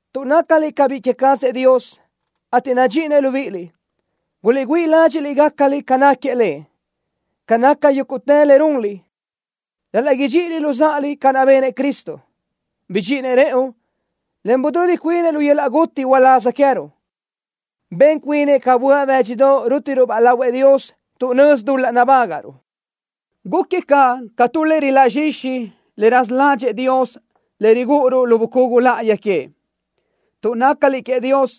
Tuʼ nácaliʼ ca biʼi queë cazëʼ Dios, ateʼ nadxíʼinëʼ libíʼiliʼ, guliʼgüíʼ ladxiʼ gácaliʼ ca náquiëʼ Lëʼ. Ca naca yúguʼtë le runliʼ: Ral-laʼ idxíʼiliʼ luzáʼaliʼ ca naʼ benëʼ Cristo. Bidxíʼinëʼ rëʼu, en budödi cuinëʼ lu yöl-laʼ guti uláz queë́ruʼ. Ben cuinëʼ ca böaʼ bë́dxidoʼ rútiruʼ-baʼ lahuëʼ Dios tuʼ nözi dul-laʼ nabágaʼruʼ. Gúquiëʼ caʼ ca tu le riláʼ zxixi le raza ládxëʼë Dios le rigúʼuruʼ lu bucugu láʼayi queëʼ. Tuʼ nácaliʼ queëʼ Dios,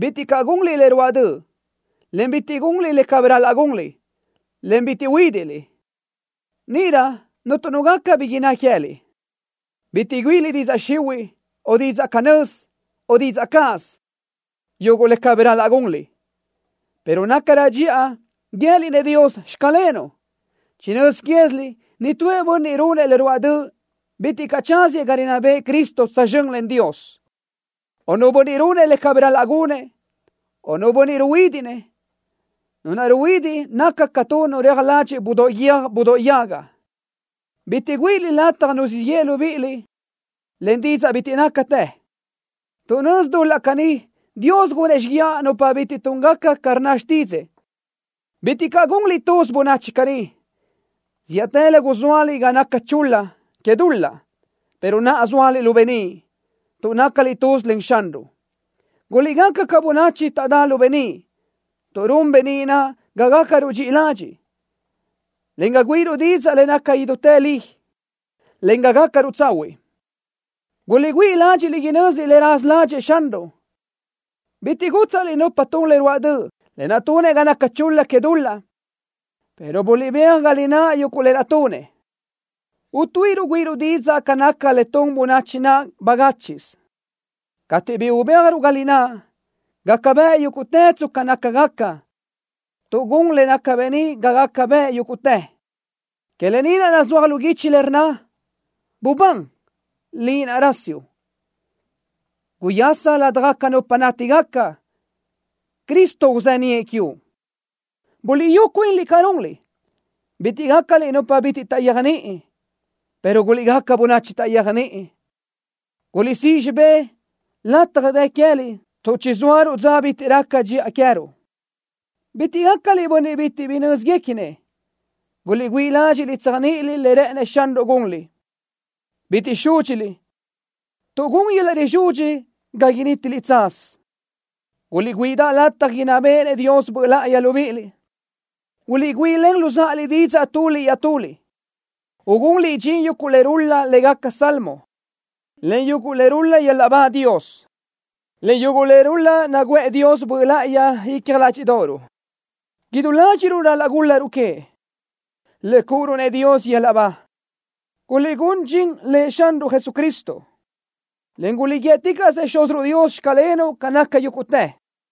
bitiʼ caʼ gunliʼ le ruáʼ döʼ, en bitiʼ gunliʼ le cabí ral-laʼ gunliʼ, en bitiʼ uhuídiʼliʼ. Níʼirö cuntu nu gaca bi innë́ queë́liʼ. Bitiʼ güíʼiliʼ didzaʼ xihuiʼ, o didzaʼ canö́z, o didzaʼ cáʼasö, yuguʼ le cabí ral-laʼ gunliʼ, pero nácarö dxiʼa guië́liʼ-nëʼ Dios: “Xclenuʼ.” Chinö́z quéziliʼ nitúëʼ bönniʼ runëʼ le ruáʼ döʼ bitiʼ caʼ tsáziëʼ ga rinná bëʼë Cristo tsözxö́n len Dios, o nu bönniʼ runëʼ le cabí ral-laʼ gunëʼ, o nu bönniʼ ruhuídiʼnëʼ. Nu naʼ ruhuidiʼ naca ca nu reaj ladxiʼ budóʼ guiö́j budóʼ yaga. Bitiʼ güíʼiliʼ lataj nu siʼ yeʼe libíʼiliʼ len didzaʼ bitiʼ nácatë. Tuʼ nözi dul-laʼ caní Dios gunëʼ xíguiaʼ nupa bitiʼ túngaca ca rnna xtídzëʼë. Bitiʼ caʼ gunliʼ tuz bönachi caní. Zíʼatëlö guzóaliʼ ga naca chul-la que dul-laʼ, pero naʼa zóaliʼ lu beníʼ, tuʼ nácaliʼ tuz len Xanruʼ. Guliʼgaca ca bönachi taʼdá lu beníʼ, tuʼ run beníʼ naʼ ga gácaruʼ dxiʼi ladxiʼ, en ga güíʼiruʼ didzaʼ le naca idútë li, en ga gácaruʼ tsahuiʼ. Guliʼgüíʼ ladxiʼ inö́ziliʼ le raza ládxëʼë Xanruʼ. Bitiʼ gútsaʼliʼ nupa tun le ruáʼ döʼ, lë naʼ tunëʼ ga naca chul-la que dul-laʼ, pero buliʼbéaj ga lináʼ yuguʼ lë naʼ tunëʼ. Utuíʼiruʼ güíʼiruʼ didzaʼ ca naca le tun bönachi naʼ bagáchiʼsö. Cateʼ bi ubéajruʼ ga lináʼ, gaca bëʼ yúguʼtë tsca nácagaca, tuʼ gun le naca beníʼ ga gaca bëʼ yúguʼtë. Que lë ni naʼ nazúaj lu guichi lë naʼ rnna: Bubán, liʼ naʼ rasiuʼ. Guyasa ladaj nupa nátigaca. Cristo uzeníʼë quiuʼ. Buliʼyú cuinliʼ ca runliʼ. Bitiʼ gácaliʼ nupa bitiʼ taʼyéajniʼini, pero guliʼgaca bönachi taʼyéajniʼi. Guliʼsíʼ xibé lataj dë queë́liʼ tuʼ chizóaruʼ dza bitiʼ raca dxiʼa queë́ruʼ. Bitiʼ gácaliʼ bönniʼ bitiʼ bi nö́zguequinëʼ. Guliʼgüíʼ ladxiʼ tséajniʼiliʼ le rë́ʼënëʼ Xanruʼ gunliʼ. Bitiʼ súdxiliʼ, tuʼ gun yöl-laʼ rizudxi ga nítiliʼ tsaz. Guliʼgüíʼidaʼ lataj inná béʼenëʼ Dios Böʼ Láʼayi libíʼiliʼ. Guliʼgüíʼilen luzáʼaliʼ didzaʼ tuliʼ iaʼtuliʼ, ugunliʼ dxin yuguʼ le rul-la lë́gaca salmo, en yuguʼ le rul-la yöl-laʼ ba Dios, en yuguʼ le rul-la naguʼë Dios Böʼ Láʼayi icja ládxiʼdoʼoruʼ. Idú ládxiʼruʼ ral-laʼ gúl-laruʼ queëʼ, le cúʼuruʼ-nëʼ Dios yöl-laʼ ba. Guliʼgún dxin Lëʼ Xanruʼ Jesucristo, en guliʼguíëticaʼsëʼ Xúziruʼ Dios: “Xclenuʼ” ca naca yúguʼtë.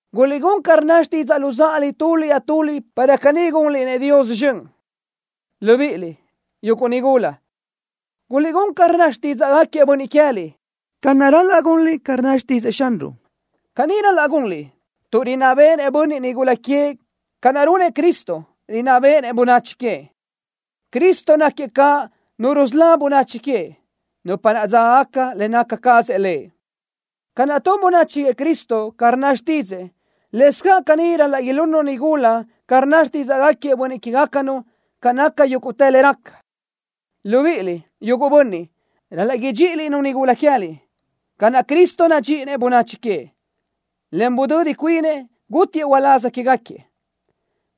Guliʼgún ca rnna xtidzaʼ luzáʼaliʼ tuliʼ iaʼtuliʼ para caní gunliʼ-nëʼ Dios zxön. Libíʼiliʼ, yuguʼ nigula, guliʼgún ca rnna xtídzaʼgaquiëʼ bönniʼ que queë́liʼ, ca naʼ ral-laʼ gunliʼ ca rnna xtídzëʼë Xanruʼ. Caní ral-laʼ gunliʼ, tuʼ rinná béʼenëʼ bönniʼ nigula queëʼ ca naʼ runëʼ Cristo, rinná béʼenëʼ bönachi queëʼ. Cristo náquiëʼ caʼ Nu rusölá bönachi queëʼ, nupa naʼ dzágagaca le naca cazëʼ Lëʼ. Ca naʼ tun bönachi queëʼ Cristo ca rnna xtídzëʼë, lëscaʼ caní ral-laʼ ilunnu nigula ca rnna xtídzaʼgaquiëʼ bönniʼ que queë́gacanu ca naca yúguʼtë le raca. Libíʼiliʼ, yuguʼ bönniʼ, ral-laʼ idxíʼiliʼ-nu nigula que queë́liʼ ca naʼ Cristo nadxíʼinëʼ bönachi queëʼ, en budödi cuinëʼ, gútiëʼ uláz quégaquiëʼ.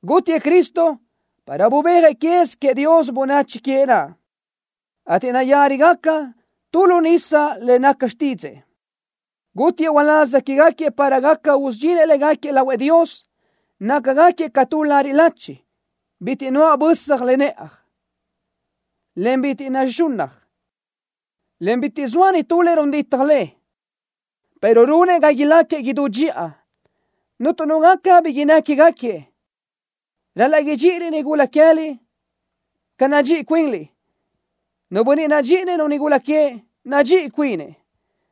Gútiëʼ Cristo para bubéajëʼ quez queëʼ Dios bönachi queëʼ naʼ, ateʼ nayárigaca tu lu nisa le naca xtídzëʼë. Gútiëʼ uláz quégaquiëʼ para gaca usudxinëʼ légaquiëʼ lahuëʼ Dios, nácagaquiëʼ ca tu lariʼ lachi, bitiʼ nuáʼ bösaj le nëʼaj, en bitiʼ naxúʼuna, en bitiʼ zoa nitú le run ditaj le, pero runëʼ ga ilácagaquiëʼ idú dxiʼa, cuntu nu gaca bi innë́ quégaquiëʼ. Ral-laʼ idxíʼiliʼ-nu nigula que queë́liʼ ca naʼ nadxíʼi cuinliʼ. Nu bönniʼ nadxíʼinëʼ-nu nigula queëʼ, nadxíʼi cuinëʼ.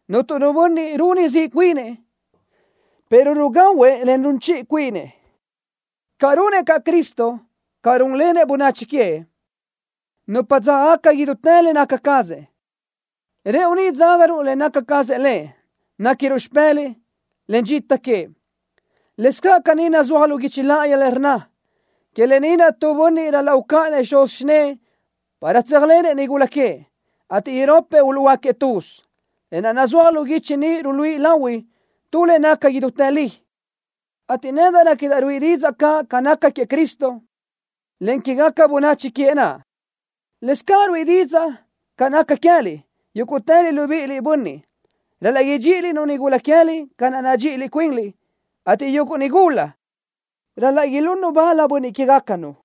Cuntu nu bönniʼ runi ziʼ cuinëʼ, pero rugahuëʼ, en run chiʼi cuinëʼ, ca runëʼ caʼ Cristo, ca rúnlenëʼ bönachi queëʼ, nupa dzágagaca idútë le naca cazëʼ. ¡Rëʼu ni dzágaruʼ le naca cazëʼ Lëʼ! ¡Néquiniruʼ xipë́lëʼë, en dxita queëʼ! Lëscaʼ caní nazúaj lu guichi láʼayi le rnna: “Que lë ni naʼ tu bönniʼ ral-laʼ ucáʼanëʼ xuz xinë́ʼë para tsöjsóalenëʼ-nu nigula queëʼ, ateʼ irópatëʼ uluʼhuöáquiëʼ tuz.” Lë naʼ nazúaj lu guichi ni ruluíʼi lahui tu le naca idútë li, ateʼ nedaʼ réquidaʼ ruíʼi didzaʼ caʼ ca naca queëʼ Cristo, en quégaca bönachi queëʼ naʼ. Lëscaʼ ruíʼi didzaʼ ca naca queë́liʼ. Yúguʼtëliʼ libíʼiliʼ, bönniʼ, ral-laʼ idxíʼiliʼ-nu nigula que queë́liʼ ca naʼ nadxíʼi cuinliʼ, ateʼ yuguʼ nigula ral-laʼ ilunnu bal bönniʼ que queë́gacanu.